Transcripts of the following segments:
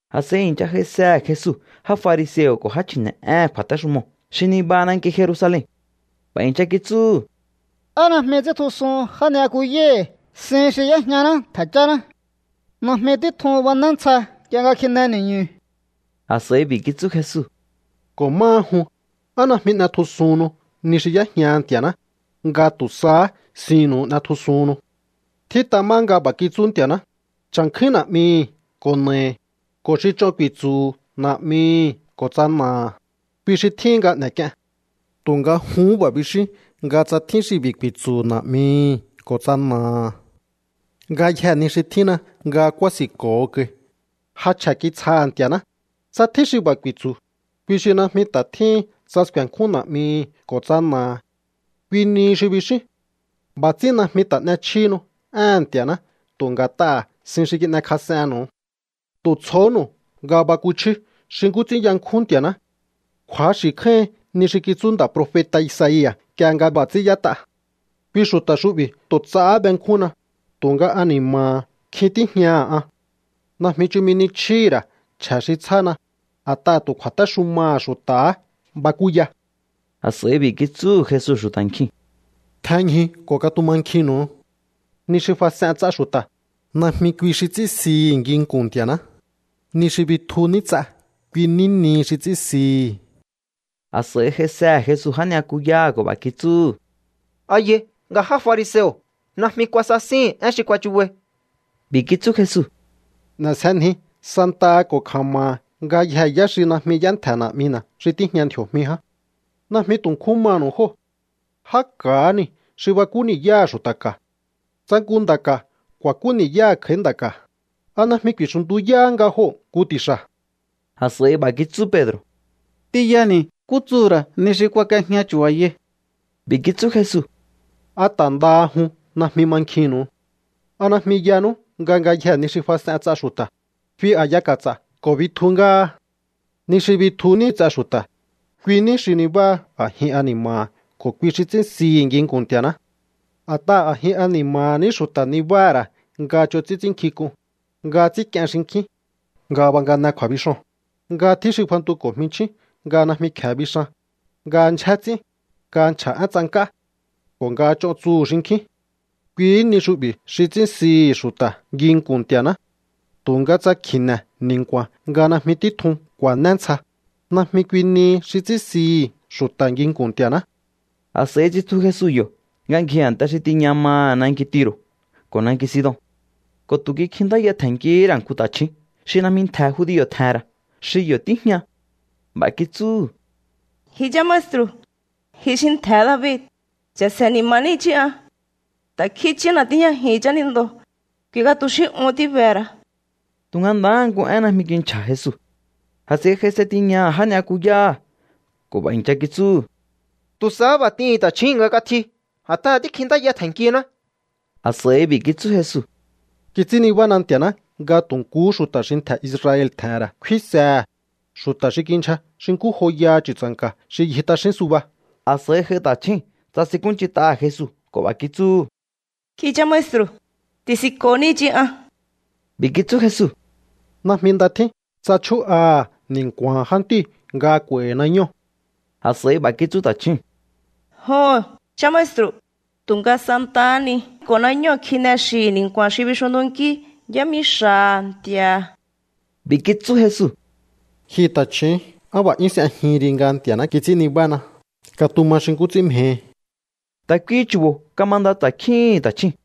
A̱s'a̱i i̱ncha j'aisehe̱ Jesu já fariseo̱ ko̱ já chji̱ne̱'éhe̱n kju̱a̱téxumoo̱ xi nibaha nanki Jerusalen. B'a̱ i̱ncha kitsúhu̱: —¿Á najmi ts'íntjusuhun já ni'yakuyáhi̱ sihi̱n xi y'éjñaná ntje̱ cháná? Najmi títjun bané ntsja nk'ie nga kjine ni̱ñu̱. A̱s'a̱i b'i̱ kitsú Jesu: —Ko̱ máha jun, ¿á najmi n'etjusuhunnu ni xi y'éjña Nti̱a̱ná, nga tu̱ sahá sinnu̱u n'etjusuhunnu? Tjít'a má nga b'a̱ kitsú Nti̱a̱ná: “Cha̱nkjúín na̱'mihi̱ ko̱ na̱ahi̱”, ko̱ “Xi ch'on ku̱i̱tsu̱hu̱ na̱'mihi̱ ko̱ tsa na̱aha̱, kui xi tjíhin nga n'e̱k'ien.” Tu̱nga juhún b'a̱ bixíún nga tsa tjín xi b'i̱ ku̱i̱tsu̱hu̱ na̱'mihi̱ ko̱ tsa na̱aha̱: “Ngayjee̱ ni xi tjínna nga kúási̱nko̱ho kai, ja chje̱ kitsjaha̱ Nti̱a̱ná”, tsa tjín xi b'a̱ ku̱i̱tsu̱, kui xi najmi ta̱ tjíhin tsa sku̱e̱nkjún na̱'mihi̱ ko̱ tsa na̱aha̱. Kui nihi xi bixíún. B'a̱ ts'ín najmi ta̱ n'echjíhinu éhe̱n Nti̱a̱ná tu̱ nga̱t'aha̱ sin xi kin'ekjas'ennu̱u. ’¡Tu̱ tsjohónu̱u nga bakuchíú xi nkú ts'ín yankjún Nti̱a̱ná! Kju̱axi̱ kjáíhin ni xi kitsú nda̱ profeta̱ Isaia̱ nk'ie nga b'a̱ ts'ín y'ét'a: Kui xu̱ta̱ xu'bi̱ tu̱ ts'ahá benkjúnna, tu̱nga ani̱ma̱ha̱ kjin tíjñaha̱ an. Najmi chumi ni chjíhi̱ ra̱ chje̱ xi tsjána, a̱t'aha̱ tu̱ kju̱a̱téxumaha̱ xu̱ta̱há bakúya. A̱s'a̱i b'i̱ kitsúhu̱ Jesu xu̱ta̱ nkjiu̱n: —Tjenñju ko̱ katumankjinnu̱u. Ni xi fas'en ts'a xu̱ta̱, najmi kui xi ts'ín sihi̱ nginku̱n Nti̱a̱ná. Ni xi bitju ní ts'a, kui ní nihi xi ts'ín sihi̱. A̱s'a̱i j'aisehe̱ Jesu já ni'yakuyáha̱ ko̱ b'a̱ kitsúhu̱: —¿A yai nga já fariseo̱ najmi kuasasíhi̱n én xi kuachubai? B'i̱ kitsú Jesu: —N'e̱sjenji santaha ko̱ kja̱ma̱ha̱ ngayjee̱ yá xi najmi y'éntje̱ Na̱'mina̱ xi tíjña ndji̱o̱jmi ján. Najmi tu̱ nkjún manu̱u jóo̱. Já ka̱há niu̱ xi bakú ni̱yáha̱ xu̱ta̱ ka̱. Tsa nku nda̱ ka̱ ku̱a̱kú ni̱yáha̱ kj'a̱í nda̱ ka̱, ¿a najmi ku̱i̱xu̱ntuyáhá nga joo̱ nku ti̱xa̱? A̱s'a̱i b'a̱ kitsú Pedro̱: —T'inyani̱ nkú tsuhu̱ ra̱ ni xi kuak'iejña chu̱ba̱yai. B'i̱ kitsú Jesu: —¿A ta̱ ndaha jun najmi mankjinnu̱u? ¿A najmi yanú nga ngayjee̱ ni xi fas'en ts'a xu̱ta̱, fi a̱ya ka̱ts'a̱ ko̱ bitju ngáha? Ni xi bitju ní ts'a xu̱ta̱, kui ní xi nibáha a̱jin ani̱ma̱ha̱ ko̱ kui xi ts'ín sihi̱ nginku̱n Nti̱a̱ná. A̱t'aha̱ a̱jin ani̱ma̱ha̱ ní xu̱ta̱ nibáha̱ ra̱ nga ch'on ts'ín ts'ínnkjink'un, nga ts'ínk'ien xinkjín, nga bangane kju̱a̱bixoo̱n, nga tjín xi fantuko̱ jminchjín nga najmi kje̱e bixan, nga ndyjé ts'ín, nga nchja̱ én tsank'á, ko̱ nga ch'on tsuhu̱ xinkjín. Kuihí ni xu'bi̱ xi ts'ín sihi̱ xu̱ta̱ nginku̱n Nti̱a̱ná. Tu̱nga tsa kji̱ne̱ ni̱nku̱a̱n nga najmi títjun ku̱a̱né ntsja, najmi kui nihi xi ts'ín sihi̱ xu̱ta̱ nginku̱n Nti̱a̱ná. A̱s'a̱i tsitju Jesu yo̱ nga ngji a̱nte xi tiña maha̱ nanki Tiro̱ ko̱ nanki Sidon. Ko̱ tu̱ kikjintáya tje̱nnkihí ra̱ nku ta̱chju̱ún xi najmi ntje̱ judio̱ tje̱he̱n ra̱ xi yo̱ tíjña. B'a̱ kitsúhu̱: —¡Ji chá maestru̱, ji xi ntje̱he̱ David, cha̱se̱ ni̱ma̱ní i̱chí an! ¡Ta̱kjín i̱chína̱ tíjñajihi̱n chánindoo̱, kui nga tu̱ xí uhún tíbehe̱ ra̱! Tu̱nga ndahá nku én najmi kinchja̱ Jesu. A̱s'a̱i j'aise tiñaha̱ já ni'yakuyáha̱ ko̱ b'a̱ i̱ncha kitsúhu̱: —Tu̱ sahá b'a̱ t'ihi̱n ta̱chjúu̱n nga katji, a̱t'aha̱ tíkjintáya tje̱nnkiná. A̱s'a̱i b'i̱ kitsú Jesu: —Kits'ín nibána Nti̱a̱ná nga tu̱ nkuhú xu̱ta̱ xi ntje̱ Israel tje̱he̱n ra̱ kfínsehe̱, xu̱ta̱ xi kindyja xi nkú joyaha chu̱tsa̱nka̱ xi ngji t'axín suba. A̱s'a̱i j'ai ta̱chjúu̱n, tsasinkúnch'int'aha̱ Jesu ko̱ b'a̱ kitsúhu̱: —¡Ji chá maestru̱, ti̱si̱nko̱ní i̱chí an! B'i̱ kitsú Jesu: —Najmi nda tjín tsa chjú'aha̱ ni̱nku̱a̱ha̱n jántíu̱ nga kj'u̱a̱i̱hi̱ nañóo̱. A̱s'a̱i b'a̱ kitsú ta̱chjúu̱n: —Joho̱n, chá maestru̱, tu̱nga santahá ni ko̱ nañóo̱ kjine xi̱hi̱ ni̱nku̱a̱n xi bixunntunkí yámixa̱ha̱ nti̱a̱ha̱. B'i̱ kitsú Jesu: —Ji ta̱chju̱ún, ¡á b'a̱ 'yún s'ejihin ri nga Nti̱a̱ná kits'ín nibána! Katuma xi nkú ts'ín mjehi. Ta̱ kuihi chu̱bo̱ kamanda ta̱kjíhi̱n ta̱chjúu̱n.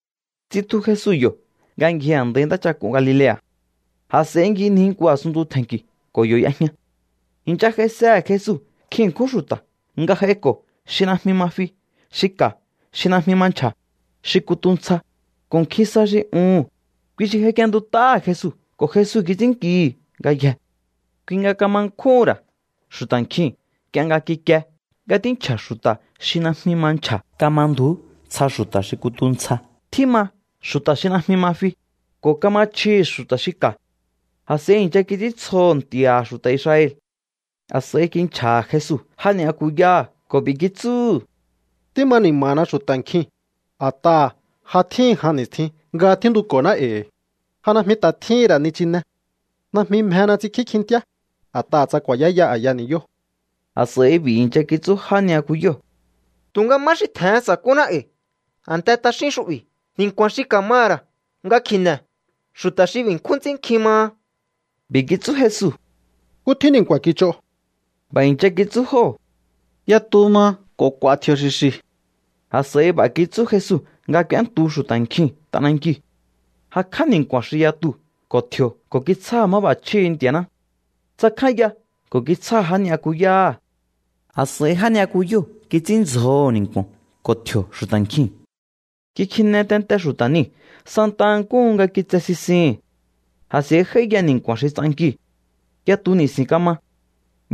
Tsitju Jesu yo̱ nga ngji a̱ndai ntáchak'un Galilea̱. A̱s'a̱i ngjinji nku a̱sunntu tje̱nki̱ ko̱ yo̱ y'ejña. I̱ncha j'aisehe̱ Jesu nkjin ṉkjún xu̱ta̱ nga j'aiko̱ xi najmi ma fi, xi ka̱, xi najmi ma nchja̱, xi kutu ntsja, ko̱ nkjin sa xi uhu̱n. Kui xi j'aik'íéntut'áha̱ Jesu ko̱ Jesu kits'ínnkihi̱ ngayjee̱. Kui nga kama nkjúhu̱n ra̱ xu̱ta̱ nkjiu̱n nk'ie nga kikie nga tínchja̱ xu̱ta̱ xi najmi ma nchja̱, kamandu̱ú ntsja xu̱ta̱ xi kutu ntsja, tjíma xu̱ta̱ xi najmi ma fi, ko̱ kama chjihi̱ xu̱ta̱ xi ka̱. A̱s'a̱i i̱ncha kits'íntsjoho̱ Nti̱a̱ha̱ xu̱ta̱ Israel. A̱s'a̱i kinchja̱ha̱ Jesu já ni'yakuyáha̱ ko̱ b'i̱ kitsúhu̱: —Tíma ni̱ma̱na xu̱ta̱ nkjii̱n, a̱t'aha̱ ja tjíhi̱n jan ni̱stjin nga tjíntuko̱ná e̱i̱. Ja najmi ta̱ tjíhi̱n ra̱ nichine. Najmi mjena ts'inkjí kjintíá, a̱t'aha̱ tsa ku̱a̱yáya a̱ya ni̱yóo̱. A̱s'a̱i b'i̱ i̱ncha kitsú já ni'yakuyóo̱: —¿Tu̱nga má xi tje̱hen sa̱kúná e̱i̱ a̱nte t'axín xu'bi̱ ni̱nku̱a̱n xi ka̱maha̱ ra̱ nga kji̱ne̱ xu̱ta̱ xi b'i̱ nkjún ts'ín nkjin maha? B'i̱ kitsú Jesu: —¿Nkú tjín ni̱nku̱a̱n kich'o? B'a̱ i̱ncha kitsú jóo̱: —Yatu maha ko̱ k'u̱a̱ tji̱o̱ xi̱xi̱. A̱s'a̱i b'a̱ kitsú Jesu nga k'úéntu xu̱ta̱ nkjiu̱n t'anankiu̱. Jakj'á ni̱nku̱a̱n xi yatuu̱ ko̱ tji̱o̱ ko̱ kitsjáha̱ máb'a̱chjíhi̱ Nti̱a̱ná. Tsakjánya ko̱ kitsjáha̱ já ni'yakuyáha̱. A̱s'a̱i já ni'yakuyóo̱ kits'ínndzjoho̱ ni̱nku̱o̱n ko̱ tji̱o̱ xu̱ta̱ nkjiu̱n. Kikjine tente xu̱ta̱ niu̱ santa nkúhu nga kitse sisihi̱n. A̱s'a̱i j'áíya ni̱nku̱a̱n xi ts'ankiu̱. Yatu ni̱si̱n kama.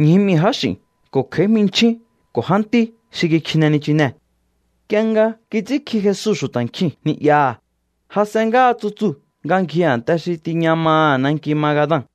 Ñju mii̱ jáx'i̱n ko̱ kj'a̱í jminchjíu̱n ko̱ jántí xi kikjine nichinee̱. Nk'ie nga kits'ínkji Jesu xu̱ta̱ nkjiu̱n ni'yaha̱, jas'en ngáha tsutsuu̱ nga ngji a̱nte xi tiña maha̱ nanki Magadan.